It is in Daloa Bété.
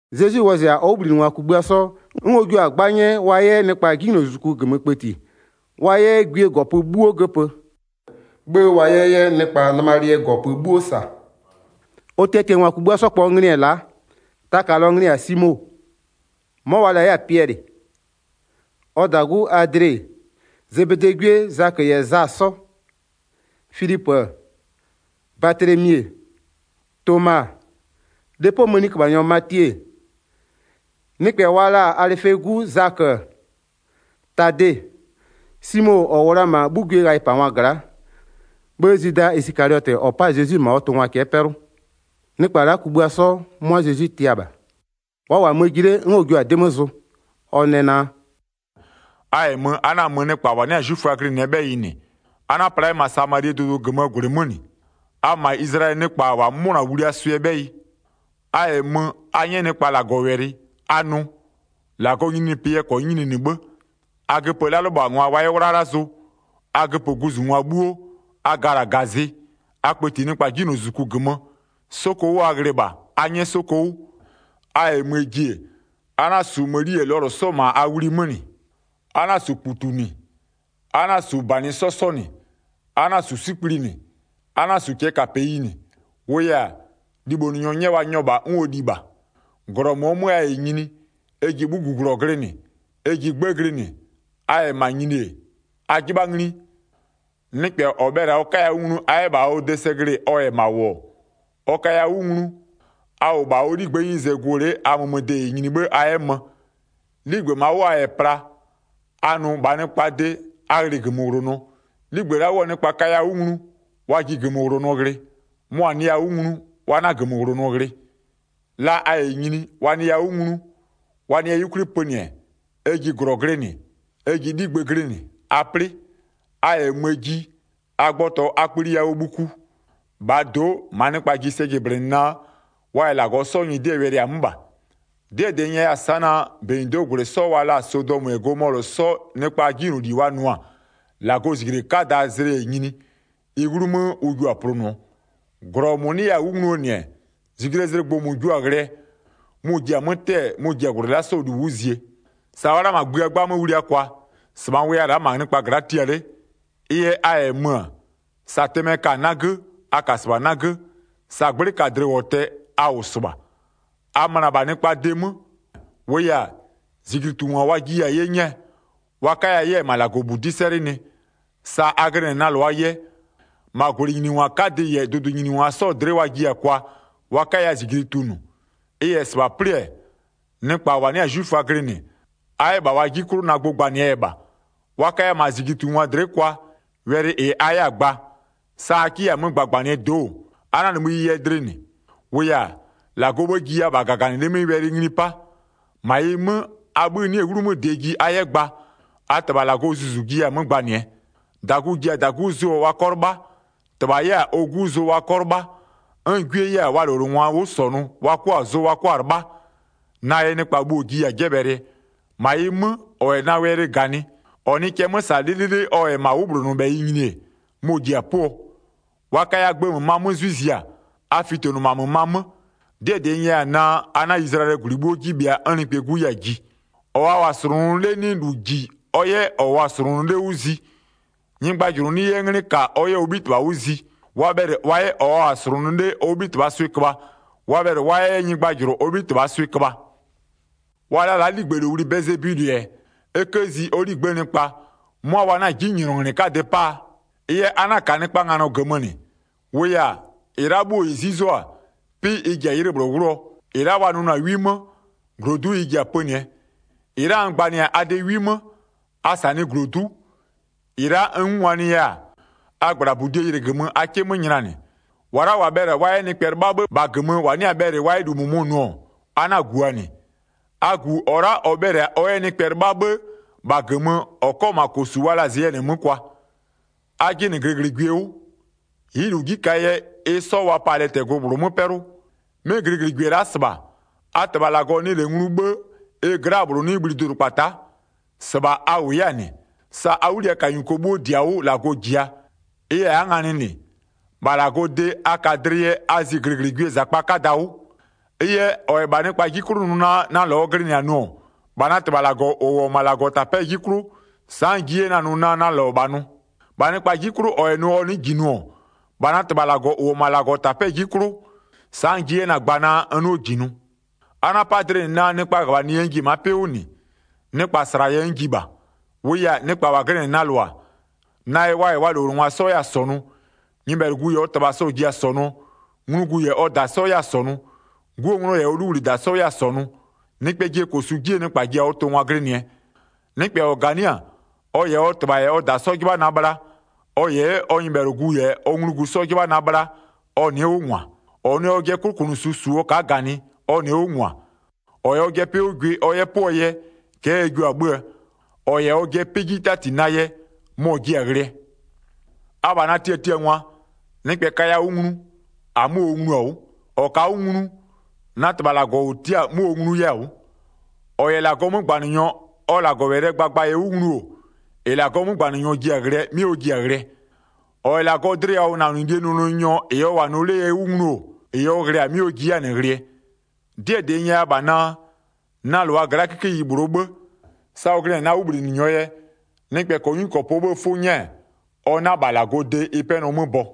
Zezwi wɔzɩ-a ɔ 'wʋbhlinɩngwa kugbïa 'sɔ, 'n ɔ jua-a 'gba 'nyɛ wa 'yɛ nɩkpa 'jinylozuzuku -gömö kpëti, wa 'yɛ gwie -gɔpö 'bhuo göpö, 'bhë wa 'yɛ 'yɛ nɩkpa nɩmalɩɛ -gɔpö 'bhuo -sa. Ɔ tiatiangwa kugbïa 'sɔ -kpɔɔ nglɩ-ɛ la'a. Taka -lɔɔ nglɩ-ɩ -yɛ-a Simo, 'mɔ wa la 'yɛ-a Piɛlɩ, ɔ -dagu Adle-e, Zebedee 'gwie Zakö -yɛ Za 'sɔ. Filipö-ö, Batlemi-e, Toma-a, lepoo mëniköbhanyɔ Matie-e, nɩkpɛ wa la-a Alɩfee 'gu Zakö-ö, Tade. Simo -ɔ -wʋ la-a -ma 'bhugwiee ghayɩpangwa gla'a, 'bhë Zwida Isɩkaliɔtɩ -ɔ 'pa-a Zezwi -ma ɔ tʋngwa cɛ'ɛ 'pɛlʋ. Nɩkpa la'a kugbïa 'sɔ, 'mʋa Zezwi tia -bha. Wa -wʋ-a mö-ö ji 'le 'n ɔ jua-a 'dɩ 'mö zʋ. Ɔ nɛ naa: “A -yɛ mö a 'na-a mö nɩkpa -wa 'nɩ-a 'zwiföa glɩnɩɛ 'bhɛyɩ -nɩ. A 'na-a pla 'yɛ -ma Samalie dʋdʋ -gömöö -gwlɩ 'mö -nɩ. A mö -ma Izlayɛlɩɛ nɩkpa -wa 'mʋnɔ-a wliaa swɩɛ 'bhɛyɩ. A -yɛ mö, a 'nyɛ nɩkpa -Lagɔwɛlɩ, a nʋ: -Lagɔɔ nyininyinipɩ yɛ -kɔnyɩ nyininɩ 'bhë. A göpö 'lalʋlɩbhangwa wa 'yɛ 'wlala zʋ, a göpö guzungwa 'bhuo, a gala -gazɩ, a kpëti nɩkpa 'jinylozuzuku -gömö. 'Soko 'wʋ a ghlɩ -bha a 'nyɛ 'soko 'wʋ. A -yɛ möö ji-e, a 'na-a -su mëni -yɛ lɔlʋ 'sɔ -ma a wlui 'mö -nɩ. A 'na-a -su -kputu -nɩ, a 'na-a -su -banɩ 'sɔ 'sɔ -nɩ. A 'na-a -su 'sikpli -nɩ, a 'na-a -su cɛɛkapeyi -nɩ. -Wʋʋ yɛ-a, libhonʋnyɔ 'nyɛ wa nyɔ -bha 'n ɔ li -bha. 11-Glɔ -mʋɔ 'mö a -yɛ nyini, ɛ ji 'bhuguglɔ glɩnɩ, ɛ ji 'gbë glɩnɩ, a -yɛ -ma nyini-e, a 'jɩbha ngli, nɩkpɛ -ɔ bhɛlɩ-a ɔ 'kaya 'wʋ nglu a 'yɛ -bha ɔ de sɛ glɩ-ɩ, ɔ -yɛ -ma -wʋ-ɔ, ɔ kaya 'wʋ nglu, a -wʋ -bha ɔ 'ligbë'ëë 'nyize gʋ-ʋ 'le a mömöde -yɛ nyini 'bhë a 'yɛ mö. 'Ligbë -maa 'wʋ a -yɛ pla, a nʋ -bhaa nɩkpaa de: A ghlɩ -gömöwlonɔ. 'Ligbë la'a 'wʋɔ nɩkpa kaya 'wʋ nglu, wa ji -gömöwlonɔ ghlɩ, mʋa-a nɩya 'wʋ nglu, wa 'na -gömöwlonɔ ghlɩ. La a -yɛ nyini, wa nɩya 'wʋ nglu, wa nɩya 'yukwli pönɩ-ɛ, ɛ ji -glɔ glɩnɩ, ɛ ji 'ligbë glɩnɩ, a 'plɩ. A -yɛ möö ji, a gbɔtɔ a kpli yawʋɔ bhuku. -Bhaa do'o, -maa nɩkpa ji sɛ jɩblɩnɩ naa, wa -yɛ -Lagɔ 'sɔɔ nyɩdɩɛ wɛlɩ-a 'mö -bha. 'Dɩɛ -dɩ n nyɛya-a sa'a naa, -benyido'oo -gwlɩ 'sɔ wa la-a Sodɔmö -yɛ Gomɔlʋ 'sɔɔ nɩkpaa 'jinyloli wa nʋ-a, -Lagɔɔ -zijle 'kadaa zlɩ -yɛ nyini, ɩ 'wlumö ʋ jua-a plʋnʋɔ, -glɔ -mʋ 'nɩya-a 'wʋ ngluo -nɩ-ɛ, -zijlee zlɩ gbʋ -mʋ jua-a ghlɩɛ, mʋ-ʋ ji-a 'mö 'tɛ-ɛɛ, mʋ-ʋ ji-a -gwlɩ la'a 'sɔɔ -lu 'wʋ zie. Sa wa'a la'a -ma gbïa 'gbamö wlia kwa, -sɩbha n wʋya-a la'a -ma nɩkpa gla'a tia 'le. Ɩ yɛ a -yɛ mö-ö, sa tɩmɛ ka-a 'nagö, a -ka -sɩbha 'nagö, sa 'gblɩ -ka-a dlɩwɔtɛ, a -wʋ -sɩbha. A möna -bha nɩkpaa de 'mö, -wʋʋ yɛ-a, -zijlitungwa wa jiya-a 'ye 'nyɛɛ, wa 'kaya 'yɛ-ɛ -ma -Lagɔbudi'i 'sɛlɩnɩ. Sa a glɩnɩ-ɛ na -lʋaa yɛ, -ma -gwlɩnyiningwa 'kadɩ -yɛ dʋdʋnyiningwa 'sɔɔ dlɩ'ɩ wa jiya-a kwa, wa 'kaya -zijli tunʋ. Ɩ -yɛ -sɩbha 'plɩ-ɛ, nɩkpa -wa 'nɩ-a 'zwiföa glɩnɩ, a 'yɛ -bha wa 'ji 'klʋ na gbʋ gbanɩɛ yɛ -bha. Wa kaya -ma -zijlitungwa dlɩ'ɩ kwa, wɛlɩ -ɩ a 'yɛ-a gba, sa a 'kɩ 'yɛ-a 'mö gbagbanɩ-ɛ do'o-o, a 'na-a nimï ɩ yɛ dlɩ -nɩ, -wʋʋ yɛ-a, -Lagɔɔ 'bhë jiya -bha -gaganɩlɩ'ɩ 'mɩ wɛlɩ ngli 'pa. 20-Ma ɩ 'mö, a 'bhï 'nɩ-ɛ 'wlumö -dɩɛ ji a 'yɛ gba, a -Tɩbha -Lagɔɔ Zuzu-u jiya-a 'mö gbanɩɛ. 21-Dagu-u ji-a -dagu zʋɔ wa 'kɔ 'lɩbha, -tɩbha 'yɛ-a ɔ 'gu zʋ wa 'kɔ 'lɩbha, 'n gwie 'yɛ-a wa -lowlengwa 'wʋ -sɔnʋ wa 'kʋa-a zʋ wa 'kʋa-a 'lɩbha. Na yɛ nɩkpa bhuo-o jiya-a 'jɛbhɛlɩɛ. -Ma ɩ 'mö, -ɔ -yɛ na wɛlɩ -ganɩ, ɔ nɩɩ cɛ 'mö -sa 'lɩlɩlɩ ɔ -yɛ -ma 'wʋbhlonʋbhɛyɩ nyini-e, mɔ-ɔ ji-a 'pʋɔ. Wa kaya gbë -mömaa 'mö 'zwɩ zia, a fitonʋ -ma -mömaa 'mö. 'Dɩɛ -dɩ n nyɛya-a naa, a 'na Izlayɛlɩɛ -gwlɩ 'bhuo 'ji bhɩa 'n Nɩkpɛɛ 'Gu 'yɛ-a ji. 24-Ɔ wa -wʋ-a -slʋnʋ 'le 'nɩ -lu -ji ɔ 'yɛ -ɔ -wʋɔ-a -slʋnʋ 'le 'wʋ zi. Nyɩgbajʋlʋ 'nɩ 'yɛ 'nglɩ -ka ɔ 'yɛ ɔ 'bhitɩbha 'wʋ zi. Wa bhɛlɩ wa 'yɛ -ɔ wa -wʋ-a -slʋnʋ 'le ɔ 'bhitɩbhaa swɩ köbha, wa bhɛlɩ wa 'yɛ 'yɛ nyɩgbajʋlʋ ɔ 'bhitɩbhaa swɩ köbha. Wa la la'a 'ligbëlowli Bɛlɩzebulɩ-ɛ, e 'kë zi ɔ 'ligbë'ëë nɩkpa, 'mʋa wa 'na-a 'jinylɔnglɩ 'kadɩ 'paa? Ɩ yɛ a 'na-a -ka nɩkpaa nganɔ -gömö -nɩ, -wʋʋ yɛ-a, -ɩ la'a 'bhuo -ɩ 'zuzo-a, 'pɩ ɩ ji-a 'ylɩ -bhlʋ 'wlʋɔ, -ɩ la'a wa nʋnʋ-a 'wi 'mö, -glodu'u ɩ ji-a pönɩɛ. 27-Ɩ la'a n gbanɩ-a a de 'wi 'mö, a -sanɩɩ -glodu'u. -Ɩ la'a n 'ngungwanɩya-a, a -gbla -budie ylɩgömö a 'kɩ 'mö nylanɩ. 28-Wa la'a -wa bhɛlɩ-a wa 'yɛ nɩkpɛ 'lɩbha 'bhë -bha -gömö -wa 'nɩ-a bhɛlɩ wa 'yɛ -lu -mʋmʋ nʋ-ɔ, a 'na-a -guʋa -nɩ. A -gu -ɔ la'a -ɔ bhɛlɩ-a ɔ 'yɛ nɩkpɛ 'lɩbha 'bhë -bha -gömö ɔ 'kɔ -ma -kosu wa la-a zeyɛnɩ 'mö kwa. A jɩnɩ -glɩglɩgwie 'wʋ, ɩ'ɩ -lu 'ji -kaa yɛ, ɩ 'sɔ wa pa-a lɛtɛglʋ -bhlʋ 'mö 'pɛlʋ. 'Mɩ -glɩglɩgwie la'a -sɩbha, a -Tɩbha -Lagɔ nɩ -lɛ nglu 'bhë, ɩ gla'aa -bhlʋ 'nɩ bhli dʋdʋkpata'a. 30-Sɩbha a -wʋ 'yɛ-a -nɩ. Sa a 'wliyakanyuko 'bhuo -di-a 'wʋ -Lagɔ -jia. Ɩ yɛ a'a nganɩ -nɩ, -bha -Lagɔɔ de a ka dlɩ yɛ a zi -glɩglɩgwiee -zakpa 'kada 'wʋ. Ɩ yɛ, -ɔ -yɛ -bha nɩkpaa 'ji 'klʋ nʋ naa na -lɔ ɔ glɩnɩ-a nʋ-ɔ, -bha na -Tɩbha -Lagɔ -ʋ -wʋ-ɔ -ma -Lagɔtapɛ'ɛɛ 'ji 'klʋ sa'a n ji 'yɛ na-a nʋɔ naa na -lɔ -bha nʋ. 33-Bha nɩkpaa 'ji 'klʋ -ɔ -yɛ nʋ ɔ nɩ'ɩ -ji nʋ-ɔ, -bha na -Tɩbha -Lagɔ -ʋ -wʋ-ɔ -ma -Lagɔtapɛ'ɛɛ 'ji 'klʋ, sa'a n ji 'yɛ na-a gbaa naa n 'nɩɔ -ji nʋ. A 'na-a 'pa dlɩ -nɩ naa nɩkpaa -ghöbhanɩ yɛ n ji-e ma'a 'pɩ 'wʋ -nɩ, nɩkpa -sla yɛ n ji -bha. 35-Wʋʋ yɛ-a, nɩkpa -wa glɩnɩ-ɛ na -lʋa, na yɛ wa -yɛ wa -lowlengwa 'sɔ 'yɛ-a -sɔnʋ, nyɩbhɛlʋgu -yɛ ɔ -tɩbha sɔ-ɔ ji-a -sɔnʋɔ, nglugu -yɛ ɔ -da 'sɔ 'yɛ-a -sɔnʋ, 'guo 'nglɔ -yɛ 'luwlida 'sɔ 'yɛ-a -sɔnʋ. Nɩkpɛɛ jɩɛ -kosu 'jie nɩkpa ji-a ɔ tʋngwa glɩnɩɛ. Nɩkpɛ -ɔ -ganɩ'ɩ-a, ɔ -yɛ ɔ -tɩbha -yɛ ɔ -da 'sɔ 'jɩbha na bhla, ɔ -yɛ 'yɛ ɔ nyɩbhɛlʋgu -yɛ ɔ nglugu 'sɔ 'jɩbha na bhla, ɔ nɩ'ɩ 'wʋ -ngwa. 38-Ɔ nɩ ɔjɩɛ 'klʋkʋnʋsu -su ɔ ka'a -ganɩ, ɔ nɩ'ɩ 'wʋ -ngwa. 39-Ɔ -yɛ ɔjɩɛ 'pɩ 'wʋ gwɩ ɔ 'yɛ 'pʋɔ yɛ, cɛ'ɛ ɛ jio-a 'bhö-öö. -Ɔ -yɛ ɔjɩɛ 'pɩ 'ji 'tati na yɛ, mɔ-ɔ jiɛ-a ghlɩɛ. Abha na tiatiangwa, nɩkpɛ kaya 'wʋ nglu, -amö ɔ nglu-a 'wʋ. -Ɔ ka'a 'wʋ nglu, na -Tɩbha -Lagɔ -ʋ tia'a-a 'mʋ ɔ nglu 'yɛ-a 'wʋ. 41-Ɔ -yɛ -Lagɔɔ 'mögbanɩnyɔ ɔ -Lagɔwɛlɩɛ gbagba yɛ 'wʋ nglu-o, -ɩ -Lagɔɔ 'mögbanɩnyɔ ji-a ghlɩɛ 'mɩ ɔ ji-a ghlɩɛ. -Ɔ -yɛ -Lagɔɔ dlɩyawʋnanɩlie nʋnʋnyɔ -ɩ ɔ -wʋ-a nʋ 'lee yɛ 'wʋ nglu-o, -ɩ ɔ ghlɩ-a 'mɩ ɔ ji 'yɛ-a -nɩ ghlɩɛ. 'Dɩɛ -dɩ n nyɛya -bha naa: Na -lʋa gla'aa 'kikeyi -bhlʋɔ 'bhë, sa ɔ glɩnɩ-ɛ na 'wʋbhlinɩnyɔɔ yɛ, nɩkpɛ -kɔɔ 'nyuwɔtʋɔ 'kɔpʋɔ 'bhëë 'fʋ 'nyɛ-ɛ, ɔ 'na -bha -Lagɔɔ de ɩ 'pɛnɔ 'mö bɔ.”